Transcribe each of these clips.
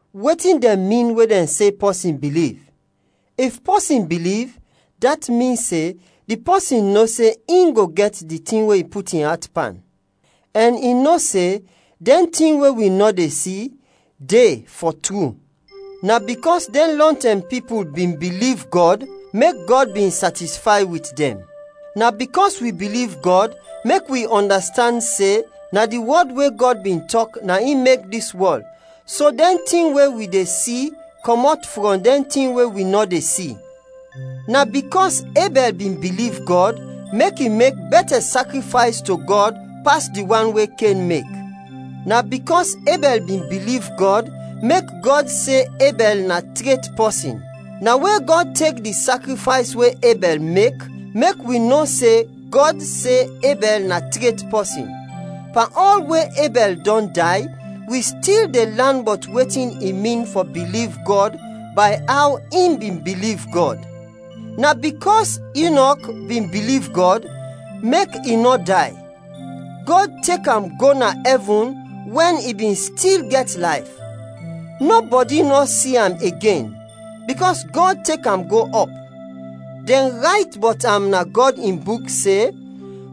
Wetin dɛn min we dɛn se pɔsin biliv? If pɔsin biliv, dat min se di pɔsin no se in go gɛt di tin we i put in at pan, ɛn i no se, dɛn tin we wi nɔ de si, de, fɔ tru. Na bikɔs dɛn lɔntɛm pipul bin biliv Gɔd, mek Gɔd bin satisfay wit dɛn. Na bikɔs wi biliv Gɔd mek wi ɔndastand se, na di wɔd we Gɔd bin tɔk na in mek dis wɔl, so dɛn tin we wi de si kɔmɔt frɔm dɛn tin we wi nɔ de si. Na bikɔs Ebɛl bin biliv Gɔd, mek i mek bɛtɛ sakrifays to Gɔd, pas di wan we Ken mek. Na bikɔs Ebɛl bin biliv Gɔd mek Gɔd se Ebɛl na tret pɔsin. Na we Gɔd tek di sakrifays we Ebɛl mek mek wi no se Gɔd se Ebɛl na tret pɔsin. Pan ɔl we Ebɛl dɔn day, wi stil de lan bɔt wetin i min fɔ biliv Gɔd bay aw in bin biliv Gɔd. Na bikɔs Inɔk bin biliv Gɔd, mek i nɔ day, Gɔd tek am go na ɛvin wɛn i bin stil gɛt layf. Nɔbɔdi nɔ si am igen, bikɔs Gɔd tek am go ɔp. Dɛn rayt bɔt am na Gɔd in Buk se,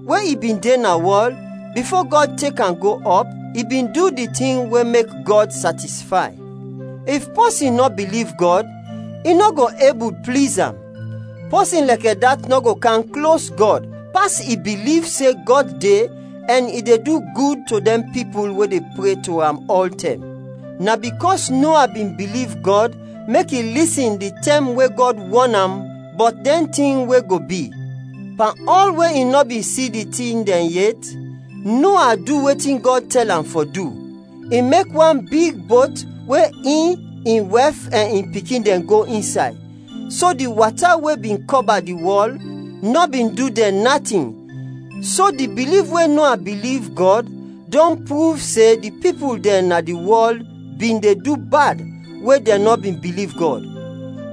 we i bin de na wɔl, bifo Gɔd tek am go ɔp, i bin du di tin we mek Gɔd satisfay. If pɔsin nɔ biliv Gɔd, i nɔ go ebul pliz am. Pɔsin lɛkɛ dat nɔ go kam klos Gɔd pas i biliv se Gɔd de ɛn i de du gud to dɛn pipul we de pre to am ɔltɛm. Na bikɔs Noa bin biliv Gɔd mek i lisin di tɛm we Gɔd wɔn am bɔt dɛn tin we go bi. Pan ɔl we i nɔ bin si di tin dɛn yet, Noa du wetin Gɔd tɛl am fɔ du. I mek wan big bot we in, in wɛf ɛn in pikin dɛn go insay, so di wata we bin kɔba di wɔl nɔ bin du dɛn natin. So di biliv we Noa biliv Gɔd dɔn pruv se di pipul dɛn na di wɔl bin de du bad we dɛn nɔ bin biliv Gɔd.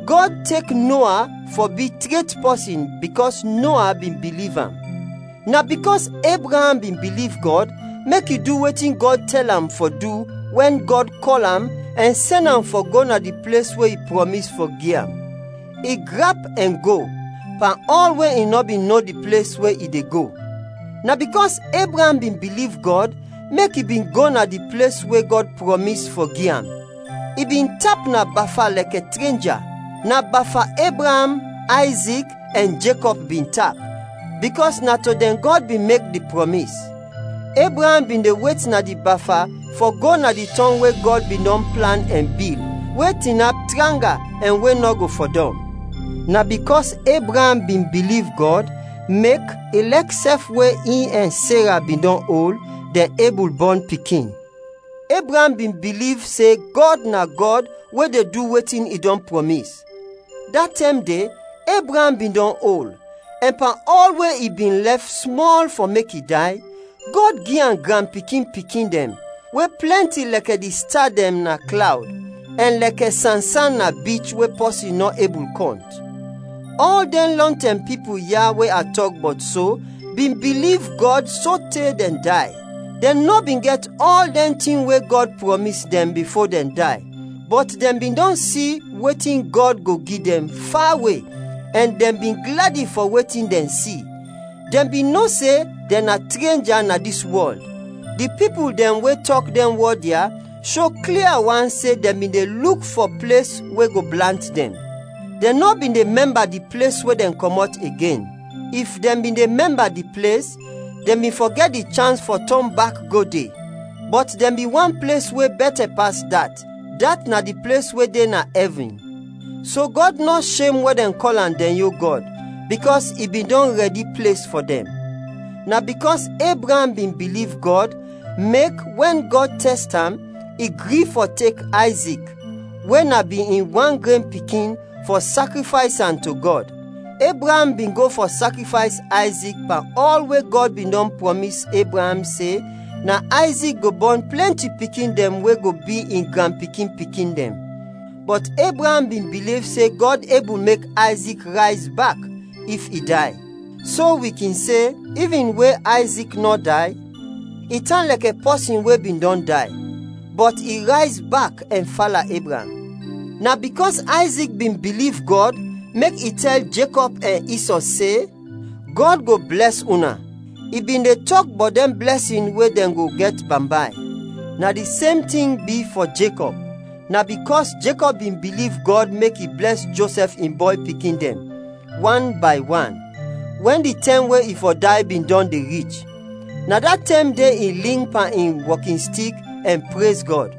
Gɔd tek Noa fɔ bi tret pɔsin bikɔs Noa bin biliv am. Na bikɔs Ebraam bin biliv Gɔd mek i du wetin Gɔd tɛl am fɔ du wɛn Gɔd kɔl am ɛn sɛn am fɔ go na di ples we i prɔmis fɔ gi am. I grap ɛn go, pan ɔl we i nɔ bin no di ples we i de go. Na bikɔs Ebraam bin biliv Gɔd mek i bin go na di ples we Gɔd prɔmis fɔ gi am, i bin tap na bafa lɛkɛ trenja. Na bafa Ebraam, Ayzik ɛn Jekɔb bin tap, bikɔs na to dɛn Gɔd bin mek di prɔmis. Ebraam bin de wet na di bafa fɔ go na di tɔng we Gɔd bin dɔn plan ɛn bil, we tinap tranga, ɛn we nɔ go fɔdɔm. Na bikɔs Ebraam bin biliv Gɔd, mek, ilɛk sɛf we in ɛn Sera bin dɔn ol, dɛn ebul bɔn pikin. Ebraam bin biliv se Gɔd na Gɔd we de du wetin i dɔn prɔmis. Da tɛm de, Ebraam bin dɔn ol, ɛn pan ɔl we i bin lɛf smɔl fɔ mek i day, Gɔd gi am granpikin-pikin dɛn we plɛnti lɛkɛ di sta dɛn na klawd, ɛn lɛkɛ sansan na bich we pɔsin nɔ ebul kɔnt. Ɔl dɛn lɔntɛm pipul ya, we a tɔk bɔt so, bin biliv Gɔd sote dɛn day. Dɛn nɔ bin gɛt ɔl dɛn tin we Gɔd prɔmis dɛn bifo dɛn day, bɔt dɛn bin dɔn si wetin Gɔd go gi dɛn, fawe, ɛn dɛn bin gladi fɔ wetin dɛn si. Dɛn bin no se dɛn na trenja na dis wɔl. Di pipul dɛn we tɔk dɛn wɔd ya sho klia wan se dɛn bin de luk fɔ ples we go blant dɛn. Dɛn nɔ bin de mɛmba di ples we dɛn kɔmɔt igen. If dɛn bin de mɛmba di ples, dɛn bin fɔ gɛt di chans fɔ tɔn bak go de. Bɔt dɛn bin want ples we bɛtɛ pas dat, dat na di ples we de na ɛvin. So Gɔd nɔ shem wɛn dɛn kɔl am dɛn yon Gɔd, bikɔs i bin dɔn rɛdi ples fɔ dɛn. Na bikɔs Ebraam bin biliv Gɔd, mek, wɛn Gɔd tɛst am, i gri fɔ tek Ayzik, we na bin in wan gren pikin, fɔ sakrifays am to Gɔd. Ebraam bin go fɔ sakrifays Ayzik pan ɔl we Gɔd bin dɔn prɔmis Ebraam se, na Ayzik go bɔn plɛnti pikin dɛn we go bi in granpikin-pikin dɛn. Bɔt Ebraam bin biliv se Gɔd ebul mek Ayzik rayz bak, if i day. So, wi kin se, ivin we Ayzik nɔ day, i tan lɛkɛ pɔsin we bin dɔn day, bɔt i rayz bak ɛn fala Ebraam. Na bikɔs Ayzik bin biliv Gɔd, mek i tɛl Jekɔb ɛn Isɔ se, “Gɔd go blɛs una.” I bin de tɔk bɔt dɛn blɛsin we dɛn go gɛt bambay. Na di sem tin bi fɔ Jekɔb. Na bikɔs Jekɔb bin biliv Gɔd mek i blɛs Josɛf in bɔy pikin dɛn, wan bay wan, wɛn di tɛm we i fɔ day bin dɔn de rich. Na da tɛm de i ling pan in wɔkinstik ɛn prez Gɔd.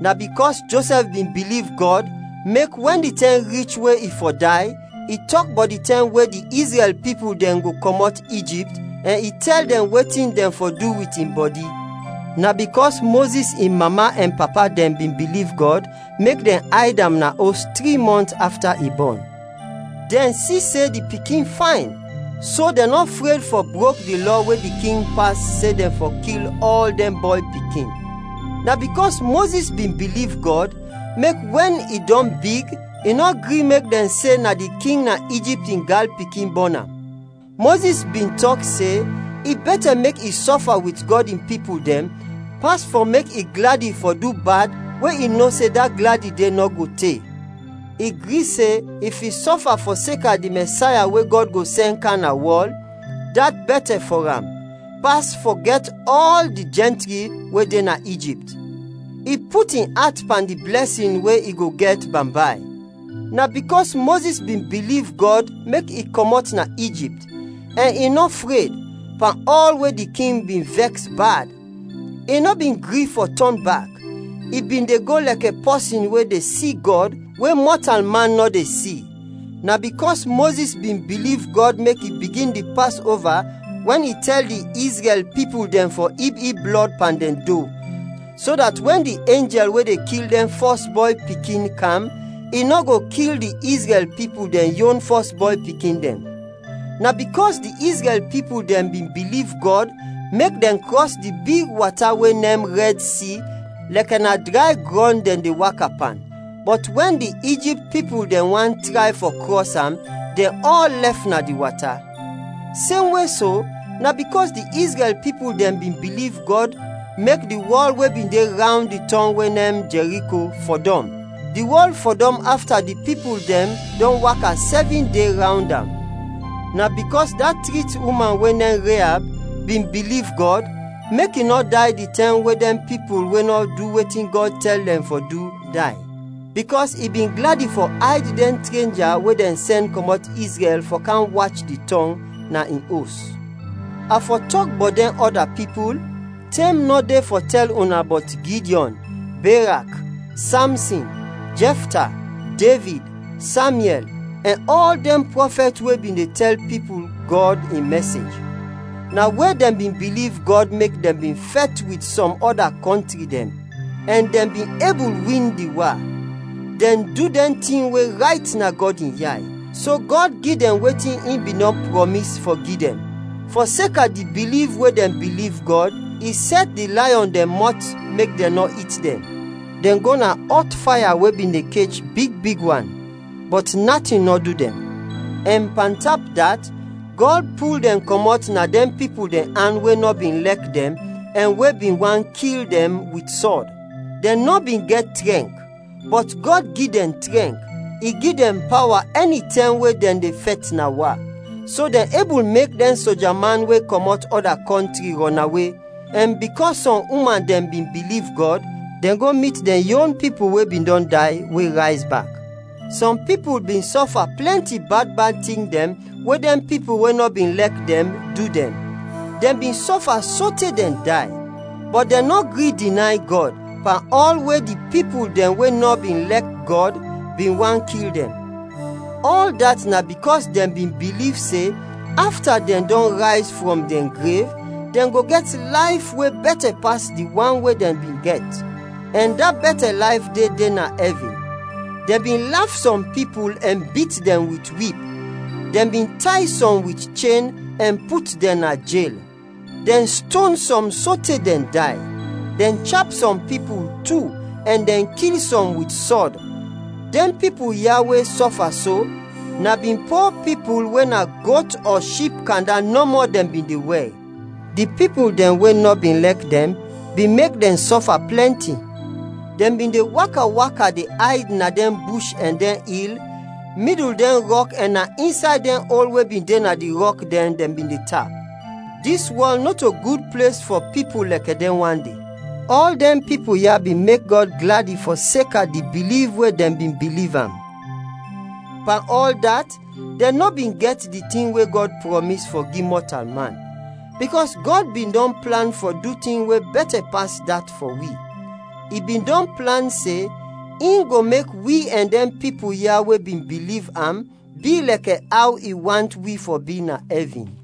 Na bikɔs Josɛf bin biliv Gɔd mek, wɛn di tɛm rich we i fɔ day, i tɔk bɔt di tɛm we di Izrɛl pipul dɛn go kɔmɔt Ijipt, ɛn i tɛl dɛn wetin dɛn fɔ du wit in bɔdi. Na bikɔs Mozis in mama ɛn papa dɛn bin biliv Gɔd, mek dɛn ayd am na os tri mɔnt afta i bɔn. Dɛn si se di pikin fayn, so dɛn nɔ fred fɔ brok di lɔ we di king pas se dɛn fɔ kil ɔl dɛn bɔy pikin. Na bikɔs Mozis bin biliv Gɔd, mek wɛn i dɔn big, i nɔ gri mek dɛn se na di King na Ijipt in gyal pikin bɔn am. Mozis bin tɔk se, i bɛtɛ mek i sɔfa wit Gɔd in pipul dɛn, pas fɔ mek i gladi fɔ du bad we i no se da gladi de nɔ go te. I gri se if i sɔfa fɔseka di Mɛsaya we Gɔd go sɛn kam na wɔl, dat bɛtɛ fɔ am, pas fɔ gɛt ɔl di jɛntri we de na Ijipt. I put in at pan di blɛsin we i go gɛt bambay. Na bikɔs Mozis bin biliv Gɔd mek i kɔmɔt na Ijipt, ɛn i nɔ fred, pan ɔl we di king bin vɛks bad. I nɔ bin gri fɔ tɔn bak, i bin de go lɛkɛ pɔsin we de si Gɔd we mɔtalman nɔ de si. Na bikɔs Mozis bin biliv Gɔd mek i bigin di Pasova wɛn i tɛl di Izrɛl pipul dɛn fɔ ib ib blɔd pan dɛn do, so dat wɛn di enjɛl we de kil dɛn fɔs bɔy pikin, kam, i nɔ go kil di Izrɛl pipul dɛn yon fɔs bɔy pikin dɛn. Na bikɔs di Izrɛl pipul dɛn bin biliv Gɔd mek dɛn krɔs di big wata we nem “Rɛd Si” lɛkɛ na dray grɔn dɛn de waka pan. Bɔt wɛn di Ijipt pipul dɛn want tray fɔ krɔs am, dɛn ɔl lɛf na di wata. Semwe so, na bikɔs di Izrɛl pipul dɛn bin biliv Gɔd mek di wɔl we bin de rawnd di tɔng we nem Jɛriko, fɔdɔm. Di wɔl fɔdɔm afta di pipul dɛn dɔn waka sɛvin de rawnd am. Na bikɔs da trit uman we nem Reab bin biliv Gɔd mek i nɔ day di tɛm we dɛn pipul we nɔ du wetin Gɔd tɛl dɛn fɔ du, day, bikɔs i bin gladi fɔ ayd dɛn trenja we dɛn sɛn kɔmɔt Izrɛl fɔ kam wach di tɔng, na in os. A fɔ tɔk bɔt dɛn ɔda pipul? Tɛm nɔ de fɔ tɛl una bɔt Gidyɔn, Berak, Samsin, Jɛfta, Devid, Samyɛl, ɛn ɔl dɛn prɔfɛt we bin de tɛl pipul Gɔd in mɛsej. Na we dɛn bin biliv Gɔd mek dɛn bin fɛt wit sɔm ɔda kɔntri dɛn, ɛn dɛn bin ebul win di wa. Dɛn du dɛn tin we rayt na Gɔd in yay, so Gɔd gi dɛn wetin i bin dɔn prɔmis fɔ gi dɛn. Fɔseka di biliv we dɛn biliv Gɔd, i sɛt di layɔn dɛn mɔt mek dɛn nɔ it dɛn; dɛn go ɔt faya we bin de kech big big wan, bɔt natin nɔ du dɛn; ɛn pantap dat, Gɔd pul dɛn kɔmɔt na dɛn pipul dɛn an we nɔ bin lɛk dɛn ɛn we bin want kil dɛn wit sɔd. Dɛn nɔ bin gɛt trɛnk, bɔt Gɔd gi dɛn trɛnk; i gi dɛn pawa ɛnitɛm we dɛn de fɛt na wa, so dɛn ebul mek dɛn soja man we kɔmɔt ɔda kɔntri rɔnawe. Ɛn bikɔs sɔm uman dɛn bin biliv Gɔd, dɛn go mit dɛn yon pipul we bin dɔn day, we rayz bak. Sɔm pipul bin sɔfa plɛnti bad bad tin dɛn we dɛn pipul we nɔ bin lɛk dɛn, du dɛn; dɛn bin sɔfa sote dɛn day, bɔt dɛn nɔ gri dinay Gɔd, pan ɔl we di pipul dɛn we nɔ bin lɛk Gɔd bin want kil dɛn. Ɔl dat na bikɔs dɛn bin biliv se, afta dɛn dɔn rayz frɔm dɛn grev, dɛn go gɛt layf we bɛtɛ pas di wan we dɛn bin gɛt, ɛn da bɛtɛ layf de de na ɛvin. Dɛn bin laf sɔm pipul ɛn bit dɛn wit wip; dɛn bin tay sɔm wit chen ɛn put dɛn na jel. Dɛn ston sɔm sote dɛn day, dɛn chap sɔm pipul tu, ɛn dɛn kil sɔm wit sɔd. Dɛn pipul ya we sɔfa so, na bin po pipul we na got ɔ ship kanda nɔmɔ dɛn bin de wɛr. Di pipul dɛn we nɔ bin lɛk dɛn bin mek dɛn sɔfa plɛnti. Dɛn bin de waka waka de ayd na dɛn bush ɛn dɛn il, midul dɛn rɔk ɛn na insay dɛn ol we bin de na di rɔk dɛn, dɛn bin de tap. Dis wɔl nɔto gud ples fɔ pipul lɛkɛ dɛn wan de. Ɔl dɛn pipul ya bin mek Gɔd gladi fɔseka di biliv we dɛn bin biliv am. Pan ɔl dat, dɛn nɔ bin gɛt di tin we Gɔd prɔmis fɔ gi mɔtalman, bikɔs Gɔd bin dɔn plan fɔ du tin we bɛtɛ pas dat fɔ wi. I bin dɔn plan se, in go mek wi ɛn dɛn pipul ya we bin biliv am bi lɛkɛ aw i want wi fɔ bi na ɛvin.